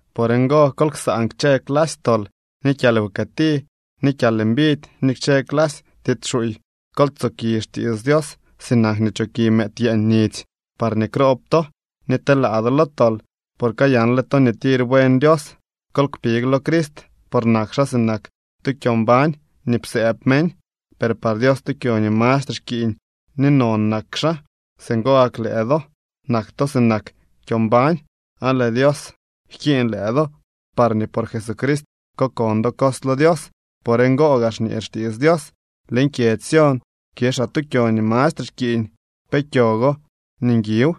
Por ngo, kol ksaan kchë clasy tol, ni kyalwkëti, ni kyalmbidy ni kchë clasy tiits xuuy. Kol tsoki xtiits Dios sinak nii choki mëëd yeeñ nidzy, parñee kroob to ni telaa do lo tol, por kayanle to nii tir buen Dios. Kol kpig lo Crist, por nak xaa sinak tu kyo mbañ nii psëëb meñ, per par Dios tu kyo nii mastre xkiiñ ni non nak xaa. Singo gak lëë do nak to sinak kyo mbañ, aan lëë Dios jkiiñ lëë do parñee por Jesucrist kokon do cos lo Dios. Por ngo gaa xñee xtiits Dios: Leñ kyedzy Sión kixaa tu kyo nii mastre xkiiñ. Pee kyo go ni nguiw.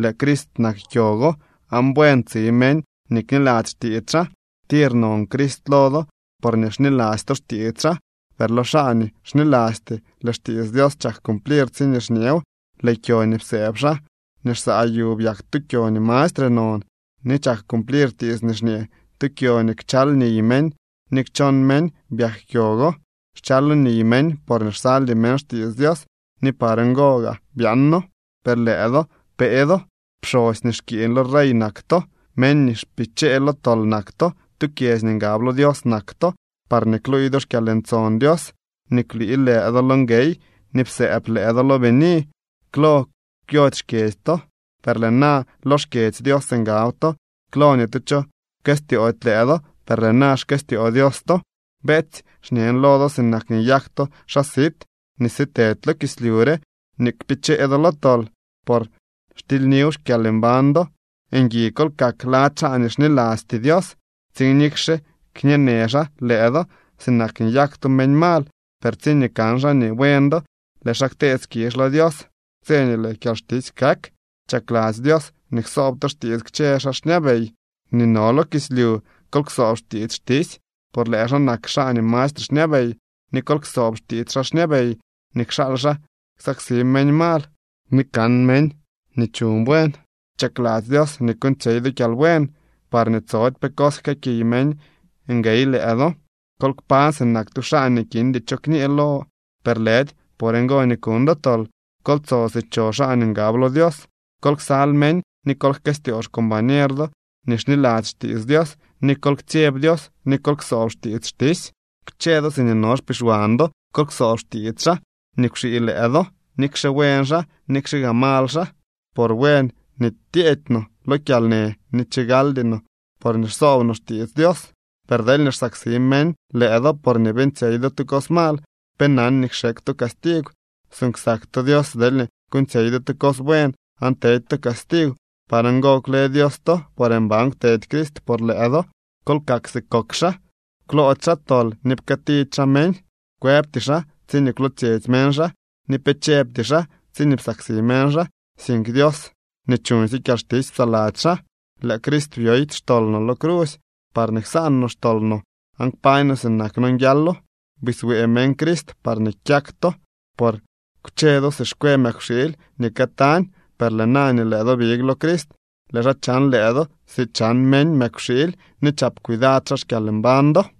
Lëë Crist nak kyo go aan buen tsi meñ nii kniladzy xtiits xaa. Tir non Crist lo do, porñee xniladzy to xtiits xaa. Per lëë lo xaa nii xnilasty, lëë xtiits Dios chak cumplir tsiñee xñeew: Lëë kyo nii psëëb xaa nii xsaa yu byak tu kyo nii mastre non. Ni chak cumplir tiits nii xñee: Tu kyo nii kchal niy meñ ni kchon meñ byak kyo go. Xchalo niy meñ porñee xsaldy meñ xtiits Dios ni par ngo gaa byaano. Per lëë do pee do, pxosy nii xkiiñ lo rey nak to, meñ nii xpichee lo tol nak to, tu kyedzy nii ngab lo Dios nak to, parñee kluuy do xkyalntson Dios nii kwlii lëë do lo nguey ni psëëb lëë do lo bini. Klo kwyody xkyedzy to, per lëë na lo xkyedzy Dios ngab to. Klo ni tu cho pkëstyoody lëë do, per lëë na xkëstyoo Dios to. Beetsy, xñen lo do sinak nii nyak to xaa sit nii sitedy lo kislyu re nii kpichee do lo tol por xtilyniw xkyalmbañ do. Ngui kol kak lady xaa nii xnilasty Dios, tsiin nikxe xñeenë xaa lëë do sinak nii nyak to meñ mal, per tsiñee kan xaa nii buen do, lëë xaa ktee skizh lo Dios tse nii lëë kyalxtisy kak. Chakladzy Dios nii ksoob to xtiits kchë xaa xñabey nii no lo kislyu. Kol ksoob xtiits xtisy, por lëë xaa nak xaa nii mastre xñabey, ni kol ksoob xtiits xaa xñabey nii kxaal xaa ksaksi meñ mal ni kan meñ nii chuñ buen. Chakladzy Dios nii kuuñtsyey do kyalbuen, parñee tsody pe cos jkëëkiy meñ nguey lëë do. Kol kpañ sinak tu xaa nii kindy cho kñee lo, per lëdy por ngo nii kuñ do tol. Kol tso si cho xaa nii ngab lo Dios. Kol ksal meñ ni kol jkëstyoo xcombañer do nii xniladzy xtiits Dios, ni kol ktsyeb Dios ni kol ksoob xtiits xtisy. Kchë do siñee no xpixwan do kol ksoob xtiits xaa nii kwxii lëë do, nikxe buen xaa nikxe gaa mal xaa. Por buen nii tyeedy no lo kyalnë nii chigaldy no porñee xsoob no xtiits Dios. Per deelñee xsaksi meñ lëë do porñee beeñtsyey do tu cos mal, ¿pe nan nii kxekw to castigw? Suuñ ksak to Dios deelñee kuuñtsyey do tu cos buen aan tedy to castigw. Par ngo kwle Dios to, por mban kwtedy Crist por lëë do. Kol kak si kok xaa. Kwloody xaa tol ni pkëëtidy xaa meñ, kwëbty xaa tsiñee kwlootsyetsy meñ xaa, ni pe chëbty xaa tsiñee psaksi meñ xaa, sink Dios nii chuñsye kyalxtisy psaladzy xaa. Lëë Crist byoy xtol no lo crusy, parñee ksaan no xtol no aan kpañ no sinak nonguialo. Biswee meñ Crist parñee kyak to. Por kwche do si xkwe mëkwxiily nii këtañ, per lëë na nii lëë do big lo Crist, lëë xaa chan lëë do si chan meñ mëkwxiily ni chap cuidad xaa xkyalmbañ do.